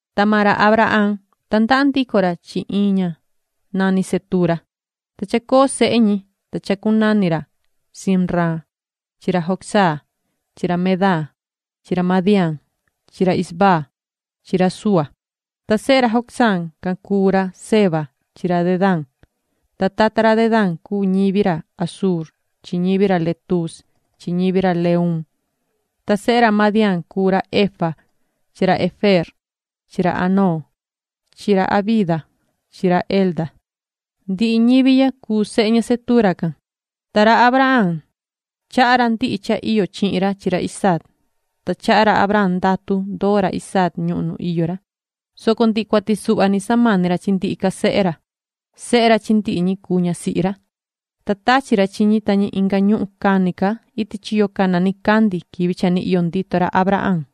Ta maan ra Abraham, tandaha ndico ra chi iin ña nani Cetura. Ta chacoo sehe ñi, cha chacunani ra Zimran chi ra Jocsán chi ra Medán chi ra Madián chi ra Isbac chi ra Súa. Ta sehe ra Jocsán can cuu ra Seba chi ra Dedán. Ta tata ra Dedán cuu ñivi ra Asur chi ñivi ra Letus chi ñivi ra Leum. Ta sehe ra Madián cuu ra Efa chi ra Efer chi ra Hanoc chi ra Abida chi ra Elda. Ndihi ñivi ya cuu sehe ña Cetura can. Ta ra Abraham, chaha ra ndihi cha iyo chihin ra chi ra Isaac. Ta chaha ra Abraham ndatu ndoo ra Isaac ñuhun nu iyo ra, soco ndihi cuati suhva ni samani ra chi ndihi ca sehe ra. Sehe ra chi ndihi ca ñi cuu ñasihi ra, ta tachi ra chi ñi ta ñi inga ñuhun cani ca iti chiyo cana nicandi quivi cha ni iyo ndito ra Abraham.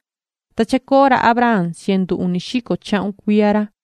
Ta chacoo ra Abraham cientu uni xico chahun cuiya ra.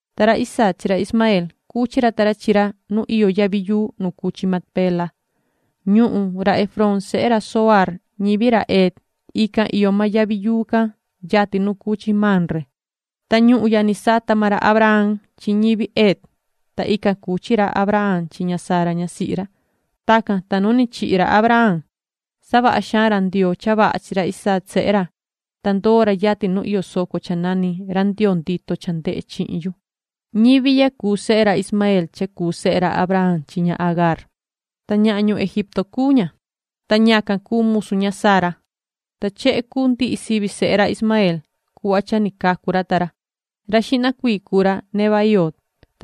Ta ra Isaac chi ra Ismaeel, cuchi ra ta ra chi ra nu iyo yavi yuu nu cuu chi Macpela. Ñuhun ra Efrón sehe ra Zohar ñivi ra Het ican iyo maan yavi yuu can yatin nu cuu chi Mamre. Ta ñuhun ya ni sata maan ra Abraham chi ñivi Het. Ta ican cuchi ra Abraham chi ña Sara ñasihi ra. Tacan, ta nu ni chihi ra Abraham, savaha xaan ra Ndioo cha vaha chi ra Isaac sehe ra, ta ndoo ra yatin nu iyo soco cha nani “Ra Ndioo ndito cha ndehe chihin yu”. Ñivi ya cuu sehe ra Ismaeel cha cuu sehe ra Abraham chi ña Agaar. Ta ñahan ñuhun Egipto cuu ña, ta ñacan cuu musu ña Sara. Ta chehe cuu ndihi sivi sehe ra Ismaeel cuhva cha ni cacu ra ta ra: Ra xihna cuii cuu ra Nebaioot,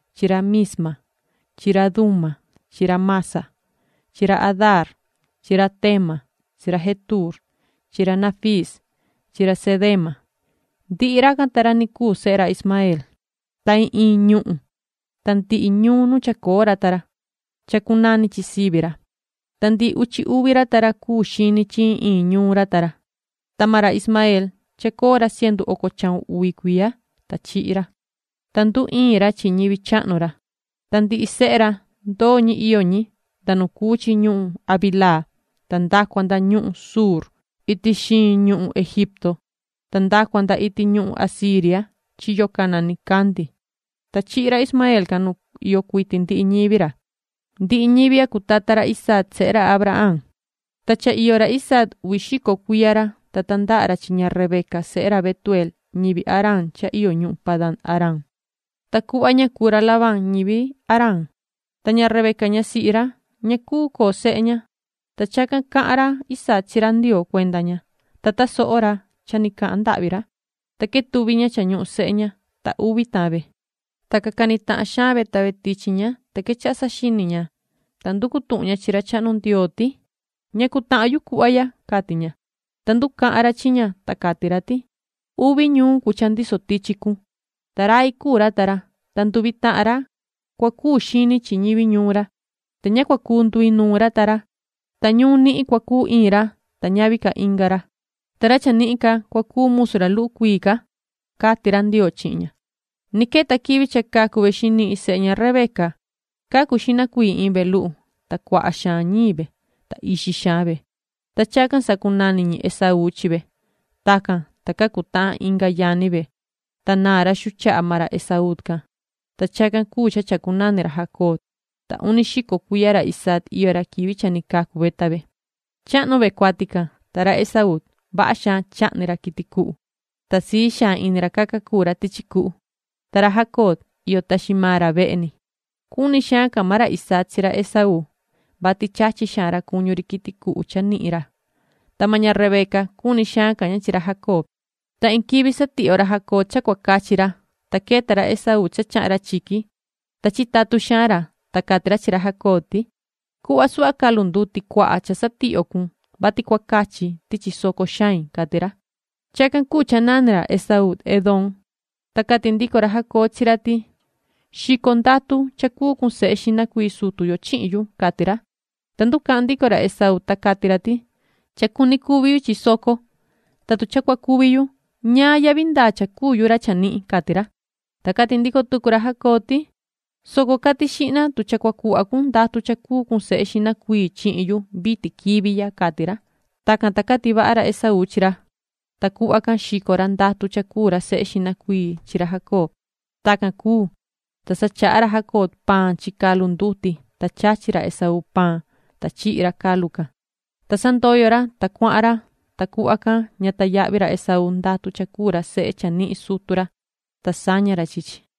chi ra Mismaa chi ra Duma chi ra Massa chi ra Hadaar chi ra Tema chi ra Jetuur chi ra Nafiis chi ra Cedema. Ndihi racan ta ra ni cuu sehe ra Ismaeel, ta iin iin ñuhun ta ndihi ñuun nu chacoo ra ta ra, chacunani chi sivi ra. Ta ndihi uchi uvi ra ta ra cuu xini chi iin iin ñuun ra ta ra. Ta maan ra Ismaeel, chacoo ra cientu oco chahun uvi cuiya, ta chihi ra, ta nduicaa ra chi ñivi chahnu ra. Ta ndihi sehe ra, ndoo ñi iyo ñi, nda nu cuu chi ñuhun Havilaa ta nda cua nda ñuhun Shuur iti xiin ñuhun Egipto ta nda cua nda iti ñuhun Asiria chiyo cana nicandi. Ta chihi ra Ismaeel can nu iyo cuiti ndihi ñivi ra. Ndihi ñivi ya cuu tata ra Isaac sehe ra Abraham. Ta cha iyo ra Isaac uvi xico cuiya ra, ta tandaha ra chi ña Rebeca, sehe ra Betueel ñivi Aram cha iyo ñuhun Padan-aram, ta cuhva ña cuu ra Labán ñivi Aram. Ta ña Rebeca ñasihi ra, ña cuu coo sehe ña, ta chacan cahan ra Isaac chi ra Ndioo cuenda ña. Ta tasoho ra Ndioo cha ni cahan ndahvi ra, ta quetuvi ña cha ñuhun sehe ña. Ta uvi tahan ve, ta ca cani tahan xaan ve ta ve tichi ña, ta quechaha saxini xaan ña, ta nducu tuhun ña chi ra chahnu Ndioo ti: “¿Ñacu tahan yu cuhva ya?”, cati ña. Ta nducahan ra chi ña, ta cati ra ti:”Uvi ñuun cuu cha ndiso tichi cun, ta rai cuu ra ta ra. Ta nduvi tahan ra cua cuu xini chi ñivi ñuun ra. Ta ña cua cuu nduinuun ra ta ra. Ta ñuun nihin cua cuu iin ra, ta ñavi ca inga ra. Ta ra chanihin ca cua cuu musu ra luhu cuii ca”, cati ra Ndioo chihin ña. Ni queta quivi cha cacu ve xinihin sehe ña Rebeca. Cacu xihna cuii iin ve luhu, ta cuaha xaan ñiin ve, ta ixi xaan ve, ta chacan sacunani ñi Esaú chi ve. Tacan, ta cacu tahan inga yani ve, ta naa ra xuu chaha maan ra Esaú can, ta chacan cuu cha chacunani ra Jacob. Ta uni xico cuiya ra Isaac iyo ra quivi cha ni cacu ve ta ve. Chahnu ve cuati can, ta ra Esaú, vaha xaan chahni ra quiti cuhu, ta sii xaan ini ra caca cuu ra tichi cuhu, ta ra Jacob, iyo taxi maan ra vehe ni. Cuni xaan ca maan ra Isaac chi ra Esaú, vati chachi xaan ra cuñu ri quiti cuhu cha nihin ra, ta maan ña Rebeca, cuni xaan ca ña chi ra Jacob. Ta iin quivi satihyo ra Jacob cha cua cachi ra, ta queta ra Esaú cha chahan ra chiqui, ta chitatun xaan ra. Ta cati ra chi ra Jacob ti: ―Cuhva suhva calu nduti cuaha cha satihyo cun, vati cua cachi ti chisoco xain ―cati ra. Chacan cuu cha nani ra Esaú Edom. Ta cati ndico ra Jacob chi ra ti: ―Xico ndatu cha cuu cun sehe xihna cuii sutu yo chihin yu ―cati ra. Ta nducahan ndico ra Esaú, ta cati ra ti: ―Cha cuni cuvi yu chi soco, ta tu cha cua cuvi yu, ñaan yahvi ndaa cha cuu yu ra chanihin ―cati ra. Ta cati ndico tucu ra Jacob ti: ―Soco cati xihna tu cha cua cuhva cun ndatu cha cuu cun sehe xihna cuii chihin yu vitin quivi ya ―cati ra. Tacan, ta cati vaha ra Esaú chi ra, ta cuhva can xico ra ndatu cha cuu ra sehe xihna cuii chi ra Jacob. Tacan cuu, ta sa chaha ra Jacob paan chi calu nduti, ta chachi ra Esaú paan, ta chihi ra calu can, ta sa ndoyo ra, ta cuahan ra. Ta cuhva can ña tayahvi ra Esaú ndatu cha cuu ra sehe chanihin sutu ra, ta saña ra chi chi.